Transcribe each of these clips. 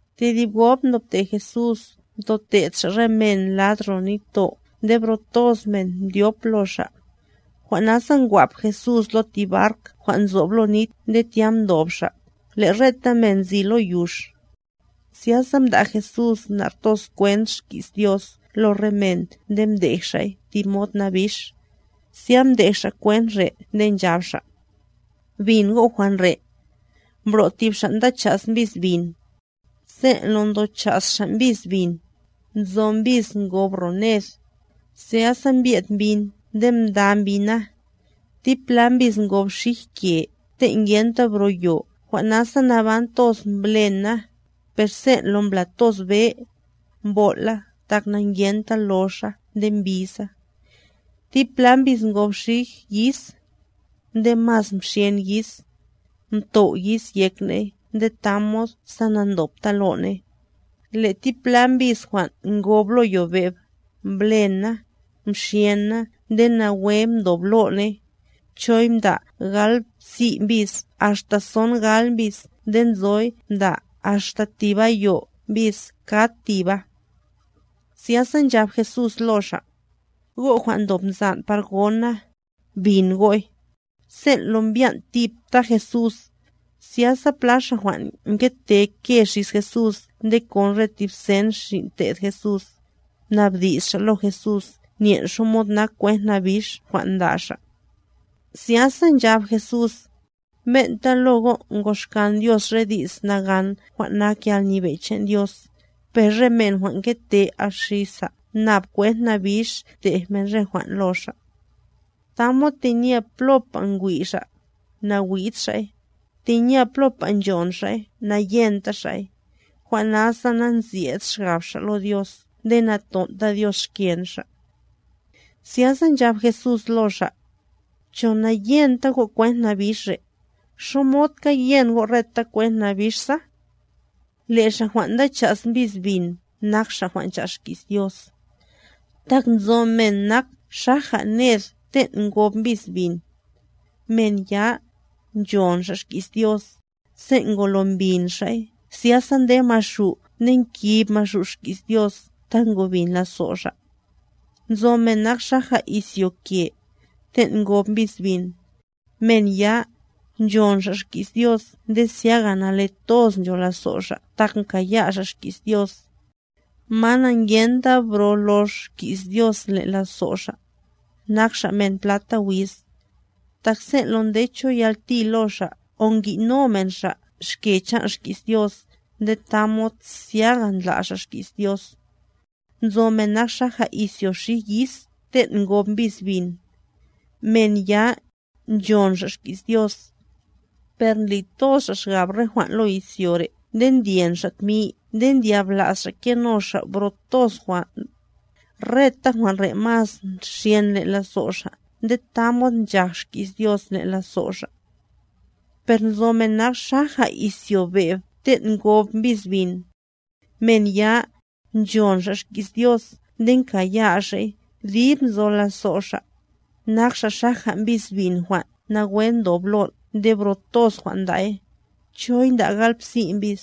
Tedib gob mdobte Jesús mtote'd Xa' re men lad ro nitto' nde bro toz men mdyop lo Xa'. Jwan' nasa ngwap Jesús lo tib bark jwan' nzob lo nit nde tya mdob Xa', le' reta men nzi lo yux. Zyasa mda' Jesús nar toz kwent xki's Dios lo re men nde mdej Xa'y tib mod nabix, zya mdej Xa' kwent re' nde nchab Xa': —Bin go' jwan' re': Mbro' tib xa' nda cha's mbis bin. Sen' lo ndo cha's xa' mbis bin, nzo mbis ngob ro ned, zyasa mbye'd mbyin nde mda mbyina. Tipla mbis ngob xij ke te' ngenta bro yo jwan' nasa naban toz mblena, per sen' lo mbla toz be, mbol' la tak nangenta loxa nde mbiza. Tipla mbis ngob xij yis; nde mas mxyen yis, mtow' yis yek ne'y nde tamod sa nandopta lo ne'y. Le' tipla mbis jwan' ngob lo yobe'b, mblen na, mxyen na nde nawe mdob lo ne'y, choy mda' galbsi' mbis axta songal mbis nde nzoy mda' axta tib ayo' mbis kad tiba. Zyasa nchab Jesús lo xa': —¡Go' jwan' ndob nzan' par gona, bin go'y! Sen' lo mbyan' tipta Jesús, zyasa pla xa' jwan' ngete nke xis Jesús nde kon re tib sen xin' te'd Jesús, mnabdi's xa' lo Jesús nyen' xamod nak kwent nabix jwan' mda' Xa'. Zyasa nchab Jesús: —Ben'ta lo go' ngoxkan Dios re di's nagan jwan' nak yalnyebe' chan' Dios; per re men jwan' ngete axisa nab kwent nabix tej men re jwan' lo xa'. Tamod tenye plopa ngwi' xa', nawi'd xa'y, tenye plopa nchon xa'y, nayenta xa'y; jwan' nasa nasyed xgab xa' lo Dios nde naton'ta Dios xken xa'. Zyasa nchab Jesús lo xa': —¿Cho nangyenta go' kwent nabix re'? ¿Xomodka yen go' reta kwent nabix sa? Le' xa' jwan' nda cha's mbis bin nak xa' jwan' ncha's xki's Dios. Tak nzo men nak xaja ned ten' ngob mbis bin. Men ya, nchon xa' xki's Dios, sen' ngolo mbin xa'y zyasa nde Maxu' nde nkib Maxu' xki's Dios ta ngobin lazo' xa'. Nzo men nak xaja izyo ke, ten' ngob mbis bin. Men ya, nchon xa' xki's Dios nde zyaga nale toz ncho lazo' xa' tak mkaya' xa' xki's Dios. Ma nangyenta bro lox xki's Dios len' lazo' xa', nak xa' men plata wiz, tak sen' lo nde cho yalti lo xa' o ngi'no men xa' xke chan' xki's Dios nde tamod zyaga ndla' xa' xki's Dios. Nzo men nak xaja izyo xij yis ten' ngob mbis bin. Men ya, nchon xa' xki's Dios, per ndli toz xa' xgab re jwan' lo izyo re' nde ndyen xa' tmi nde ndyabla's xa' keno xa' bro toz jwan', reta jwan' re' mas nxyen len' lazo' xa' nde tamod nchaj xki's Dios len' lazo' xa'. Per nzo men nak xaja izyo be'b ten' ngob mbis bin. Men ya, nchon xa' xki's Dios nde nkaya' xa'y dib nzo lazo' xa', nak xa' xaja mbis bin jwan' nawe ndob lon' nde bro toz jwan' nda'y, choy nda' galbsi' mbis,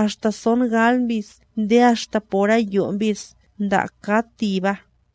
axta songal mbis nde axta por ayo' mbis nda' kad tiba.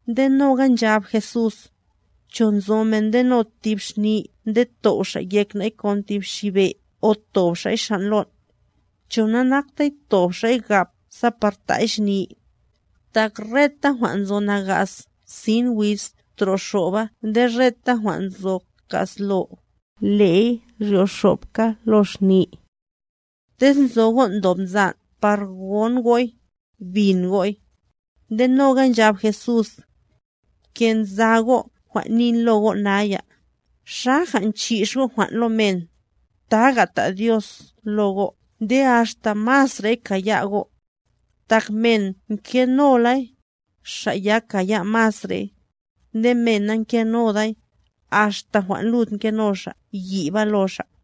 Nde noga nchab Jesús: —¿Cho nzo men ndeno tib xni nde tow' xa' yek nay kon tib xi be' o tob xa'y xan' lon'? ¿Cho nanakta tob xa'y gap sa par ta'y xni? Tak reta jwan' nzo nagas sin wiz troxoba nde reta jwan' nzo ka'slo, le'y ryoxobka lo xni. ¡Tez nzo go' ndob nzan' par gon go'y, bin go'y! Nde noga nchab Jesús: —Bke' nza go' jwan' nin lo go' naya, xaja nchix go' jwan' lo men, taga ta' Dios lo go' nde axta masrey kaya' go'. Tak men ngenolay, xa' ya kaya' masrey; Nde men nangenoday, axta jwan' lud ngeno xa' yiba lo xa'.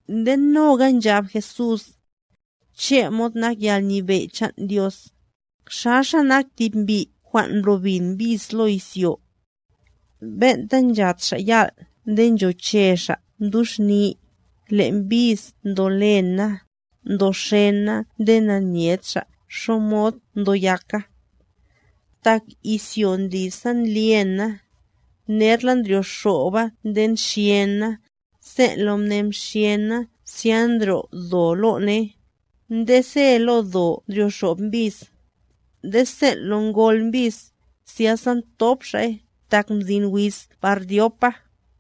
Nde noga nchab Jesús: —Chemod nak yalnyebe' chan' Dios, xaxa nak tib mbi' jwan' mblo bin mbis lo izyo. Ben'ta nchàt xa' yal' nde nchoche xa' mduxni, le' mbis ndo lena, ndo xena nde nanyed xa' xamod ndo yaka. Tak izyo ndli sa ndlyena, nerla ndryoxoba nde nxyena, sen' lo mne mxyena zya ndryo' do lo ne'y, nde se lo do ndryoxob mbis. Nde sen' lo ngol mbis, zyasa thop xa'y, tak mzin wiz par dyopa.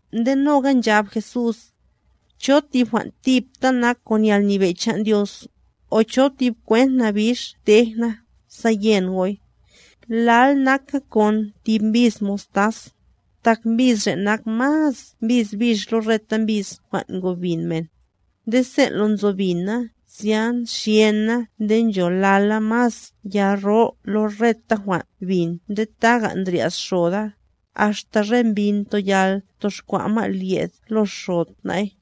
Nde noga nchab Jesús: —¿Cho tib jwan' tipta nak kon yalnyebe' chan' Dios, o cho tib kwent nabix tej na, sa yen go'y? Lal naka kon tib mbis mostaz, tak mbis re' nak mas mbis bix lo reta mbis jwan' ngobin men. Nde sen' lo nzo bina zya nxyena nde ncholala mas ya ro lo reta jwan' bin nde taja ndryas xoda, axta re mbyin toyal toxkwa' ma' lyed lo xod na'y.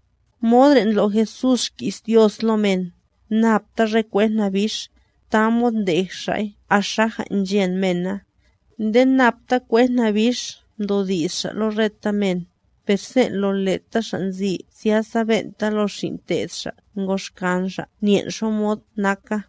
Mod re' ndlo' Jesús xki's Dios lo men, napta re kwent nabix, tamod ndej Xa'y axaja nchen mena. Nde napta kwent nabix mdodi's Xa' lo reta men; per sen' lo leta xa' nzi zyasa ben'ta lo xin' te'd Xa' ngoxkan Xa' nyen' xamod naka.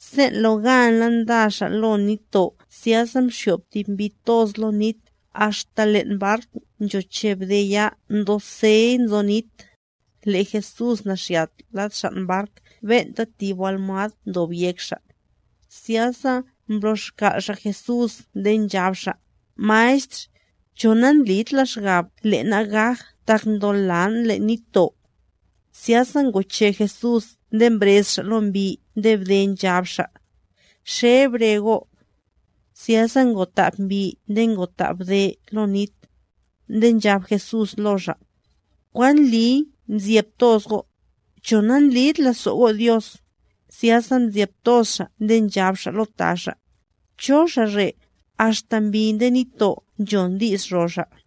Sen' lo ganla nda xa' lo nitto' zyasa mxyob tib mbi toz lo nit, axta len' bark nchote bde ya ndosey nzo nit. Le' Jesús naxyat lad xan' bark ben'ta tib almwad ndob yek Xa'; zyasa mblo' xkal' xa' Jesús nde nchab xa': —Maestr, ¿cho nandlid la xgab le' na' gaj tak ndolan' len' nitto'? Zyasa ngoche Jesús nde mbrez Xa' lo mbi nde bde, nchab Xa': —¡Xe bre go'! Zyasa ngotab mbi nde ngotab bde lo nit. Nde nchab Jesús lo xa': —¿Kwan ndliy mzyeb toz go'? ¿Cho nandlid lazo' go' Dios? Zyasa mzyeb toz xa' nde nchab xa' lo ta xa': —¿Cho Xa' re', axta mbi nde nitto' nchona di's ro Xa'?